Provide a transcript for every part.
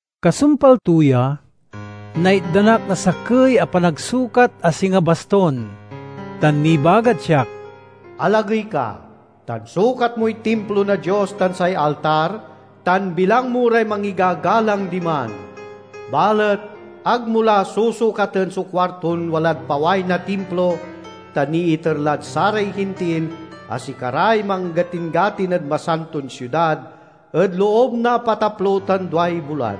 Kasumpal to ya, naitdan ak na sakey a panagsukat a singa bastun, tan nibagad siak: "Alagey ka, tan sukat moy timplo na Dios tan say altar, tan bilang mo ray mangigagalang diman. Balet ag mo la susukaten so kuarton walad paway na timplo, ta niiter lad saray Hintil, a sikaray manggatin-gatin ed Masanton Siudad ed loob na apataplo tan duay bulan.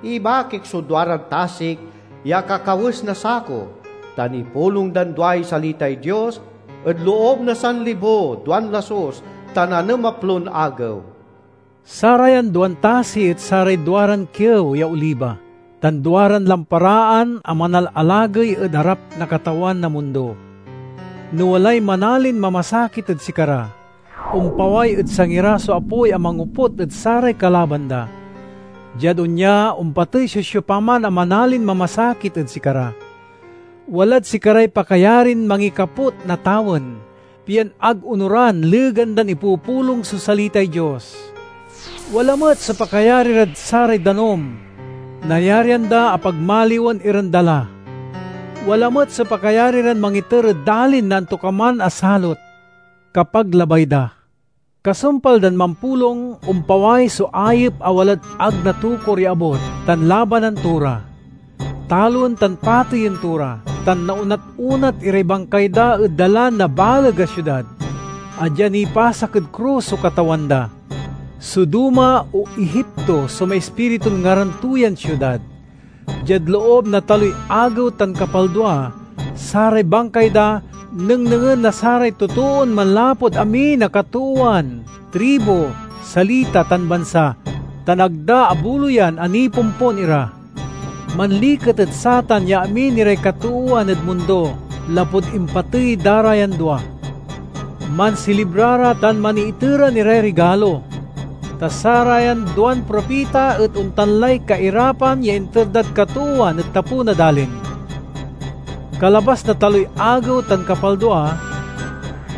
Ibakik so duaran tasik ya akakawes na sako, tan ipulong dan duay salitay Dios ed loob na sanlibo, duan lasus tan anemaplon agew." Sarayan duan tasi et saray duaran kiew ya oliba tan duaran lamparaan a manalalagey ed arap na Katawan na mundo. No walay manalin mamasakit ed sikara, ompaway ed sangi ra so apoy a mangoput ed saray kalaban da. Diad onya ompatey so siopaman a manalin mamasakit ed sikara. Walad sikaray pakayarin mangikaput na tawen, pian ag onoran legan dan ipupulong so salitay Dios. Wala met so pakayari rad saray danum; nayarian da a pagmaliwen iran dala. Wala met so pakayari ran mangiter ed dalin na antokaman a salot, kapag labay da. Kasumpal dan mampulong, ompaway so ayep a walad ag natokur ya abut, tan labanan to ra. Taloen tan pateyen to ra, tan naonat-onat iray bangkay da ed dalan na baleg a siudad, a dia nipasak ed krus so Katawan da. Sodoma o Egipto so maispiritun ngaran to yan siudad. Diad loob na taloy agew tan kapaldua, saray bangkay da nengnengen na saray totoon manlapud amin a katoowan, tribu, salita tan bansa; tan ag da abuloyan a nipompon ira. Manliket ed satan ya amin iray katoowan ed mundo lapud impatey da ra yan dua. Mansilibra ra tan maniiteran iray rigalo, ta sarayan duan propita et ontan lay kairapan ya inter dad katoowan ed tapew na dalin. Kalabas na taloy agew tan kapaldua,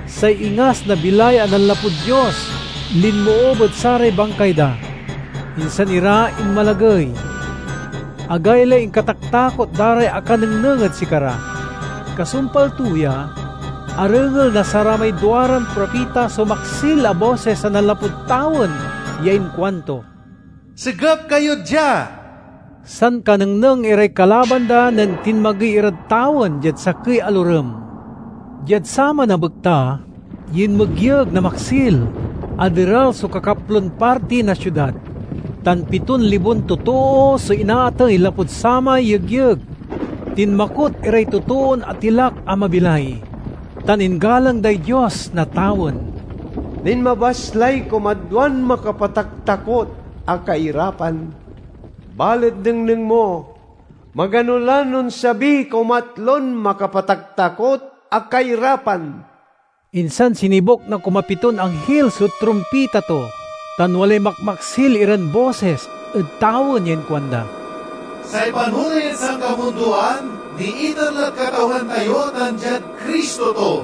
say ingas na bilay a nanlapud Dios linmoob ed saray bangkay da, insan ira inmalagey. Agaylay inkataktakot da ray akanengneng ed sikara. Kasumpal to ya, arengel na saramay duaran propita so maksil a bosis a nanlapud tawen ya inkuanto, "Segep kayo dia!" Sankanengneng iray kalaban da nen tinmagey irad tawen diad sakey a lorem. Diad saman a bekta, yinmegyeg na maksil. Aderal so kakaplon parti na siudad, tan piton libon totoo so inaatey lapud samay yegyeg. Tinmakot iray totoon atilak a mabilay, tan inggalang day Dios na tawen. Linmabas lay kumadwan makapataktakot a kairapan, balet nengneng mo! Magano lan onsabiy kumatlon makapataktakot a kairapan. Insan sinibuk na kumapiton anghil so trumpita to, tan walay makmaksil iran bosis ed tawen ya inkuanda, "Say panoley ed sankamundoan niiter lad Katawan tayo tan diad Cristo to,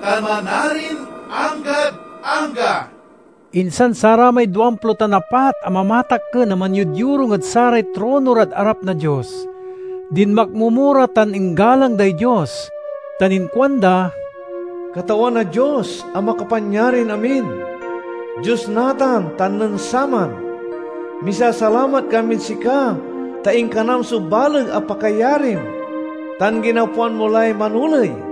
tan manarin anggad angga!" Insan saramay duamplo tan apat a mamatakken a manyodyorung ed saray trono rad arap na Dios, dinmakmomo ra tan inggalang day Dios, tan inkuanda: "Katawan a Dios a Makapanyarinamin, Dios natan tan nen saman! Misasalamat kamid sika ta inkanam so baleg a pakayarim, tan ginapwan mo lay manoley!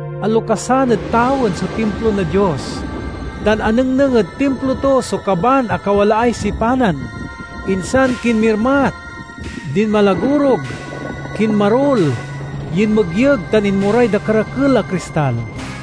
Alokasan ed tawen so timplo na Dios, tan anengneng ed timplo to so kaban a kawalaay sipanan. Insan kinmirmat, dinmalagorug, kinmarul, yinmegyeg, tan inmoray dakerakel a kristal.